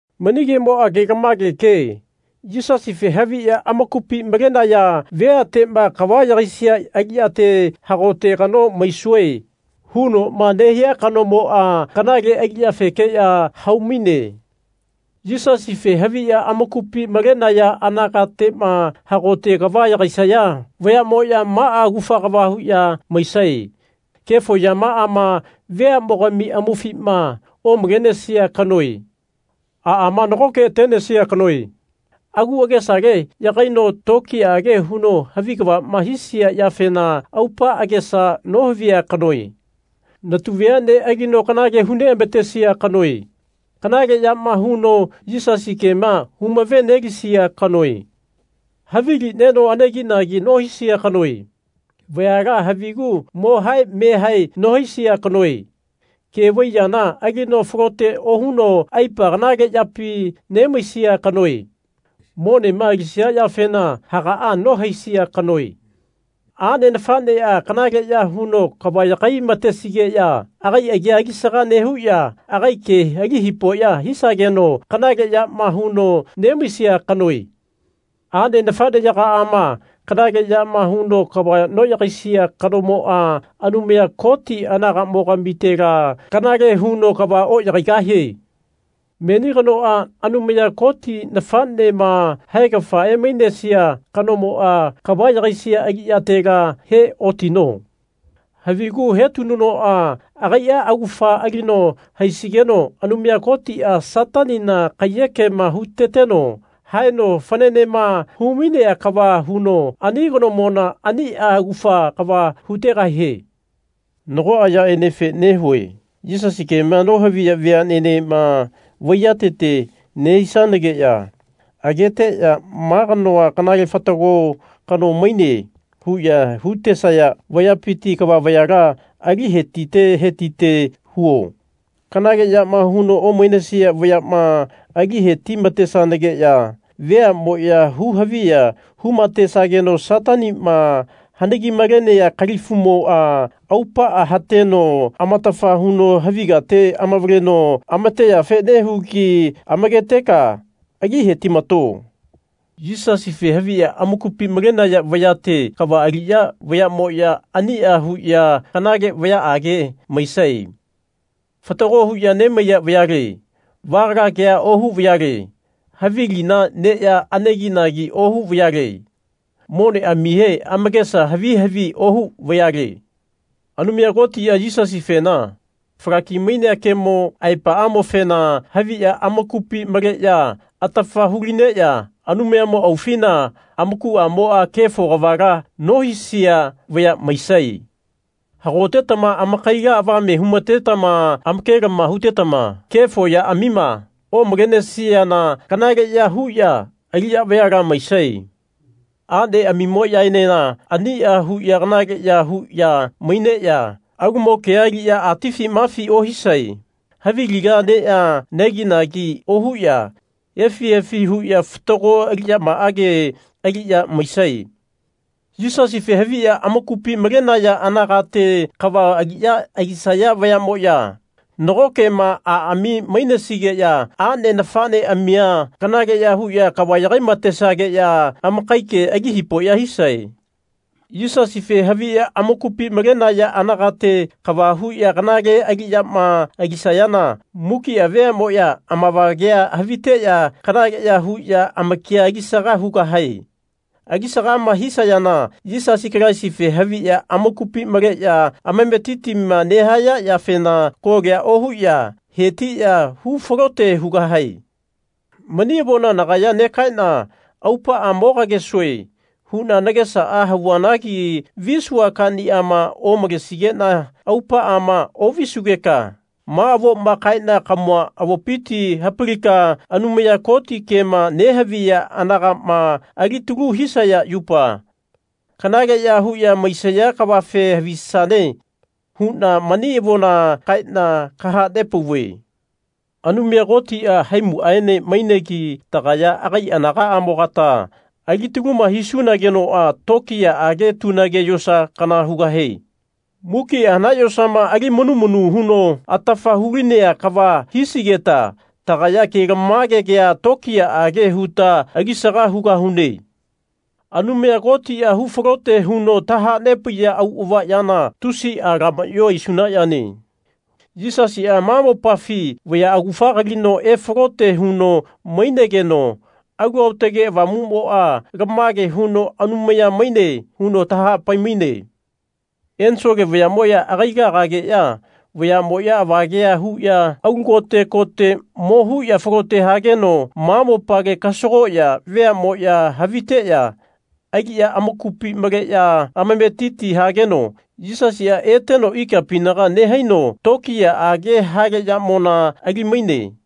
Mani kemoa kelamage ke. Yisasife haviya amakupi malenaya veatema kava yagaisia aliyate Hagote kano maisue. hunoma nehia kanomoa kanale aliyafekeya haumaine. Yisasife haviya amakupi malenaya anagatema hagote kava yagaisaya vayamoa maa augafa kava huya maisae. Kefo yamaama veamogami amaufima omalenesia kanoe. Aama nagoke atenesia kano. Agu agesale yagaino tokiyaage huno havi kavama hisia yafena aupa agesa nohavia kanoe. Natu veane alino kanale hu neamatesia kanoe. Kanaleyama huno Yisasi kema humave-nelisia kanoe. Havili neno aneginagi nohisia kanoe. Vayala havigu mohae mehae nohisia kanoe. Ke vai yana alino falote ohuno aipa kanale yapi nemaisia kanoe. Monema alisia yafena hagaa nohaesia kanoe. Ane nafanea kanaleya huno kava yagai-matesigeya agai agi alisaga nehuya agai ke ali hipoya hisageno kanale yama huno nemaisia kanoe. Ane nafaneyagaama kanaleyama huno kava noyagaisia kanomoa Anumaya Koti anagamogamitela kanale huno kava oyagaigahie. Meni kanoa Anumaya Koti nafanema haegafa emainesia kanomoa kava yagaisia aliyatela he otino. Havigu hetinunoa agaia augafa alino haisigeno Anumaya Kotia Satanina kaiyekema huteteno haeno fananema humainea kava huno ani kanomona ania augafa kava hutegahie. Nagoa yaenefe nehue Yisasi kema nohaviya veanenema vaiyatete nehisigeya ageteya Ma kanoa kanale fatago kano maine. huya hutesaya vayapiti kava vayala ali hetite hetite huo. Kanale yama huno omainesia vayama ali heti-matesanageya veamoya hu haviya humatesageno Satanima hanagi-malenea kalifumoa aupaa hateno amatafa huno havi kate amavaleno amateyafe nehugi amaketeka ali hetimato. Yisasife haviya amakupi malenaya vayate kava aliya vayamoya ania huya kanale vayaage maisae. Fatago huya nemaiya vayale. Vagala kea ohu vayale. Havi lina neya aneginagi ohu vayale. Moneamihe amakesa havi havi ohu vayale. Anumaya Kotia Yisasifena falaki-mainea kemo aepaamofena haviya amakupi maleya atafa hu-lineya Anumayamo aufina amakuamoa kefo kavala nohisia vaya maisae. Hagotetama amakaila avame humatetama amakelama hutetama kefo yaamima omalenesiana kanaleya huya aliya vayala maisae. Aneamimoyaenena ania huya kanale ya huya maineya alumo kea aliya atifi mafi ohisae. Havi lina neya aneginagi ohuya efi efi huya fatago aliyamaage aliya maisae. Yisasife haviya amakupi malenaya anagate kava aliya alisaya vayamoya nagokema aami mainesigeya ane nafaneamia kanaleya huya kava yagai-matesageya amakai ke ali hipoya hisae. Yisasife haviya amakupi malenaya anagate kava huya kanale aliyama alisayana mukia veamoya amavagea haviteya kanaleya huya amakia alisaga hugahae. Alisagama hisayana Yisasi Kalaisife haviya amakupi maleya amametitima nehaya yafena kolia ohuya hetiya hu falote hugahae. Mani avona nagaya negaena Aupaa mo kagesue. huna nagesaa havuanagi visua kaniama omalesigena aupaama ovisugeka ma avoma kaena kamua avopiti hapalika Anumaya Koti kema nehaviya anagama alitalu hisaya yupa kanaleya huya maisaya kavafe havisane huna mani avona kaena kahanepauve. Anumaya Kotia haimuaene mainegi tagaya agai anagaamogata alitaluma hisunagenoa tokiyaage tunage yosa kana hugahie. Mukia hanae yosama ali manu manu huno atafa hulinea kava hisigeta tagaya kelamage kea tokiyaage huta alisaga hugahune. Anumaya Kotia hufalote huno tahanepaiya auava yana tusia lamayo aisuna yane. Yisasia ma mopafi vaya augafa kalino efalote huno mainegeno Alu Aotage Avamumoa Lamage huno Anumaya maine. huno tahapai-maine. Ensole vayamoya agaila agageya vayamoya avagea huya alu kote kote mo huya falote hageno ma mopale kasagoya veamoya haviteya aliya amakupi maleya amametiti hageno Yisasia eteno ikapinaga nehaino tokiyaage hale yamona ali-maine.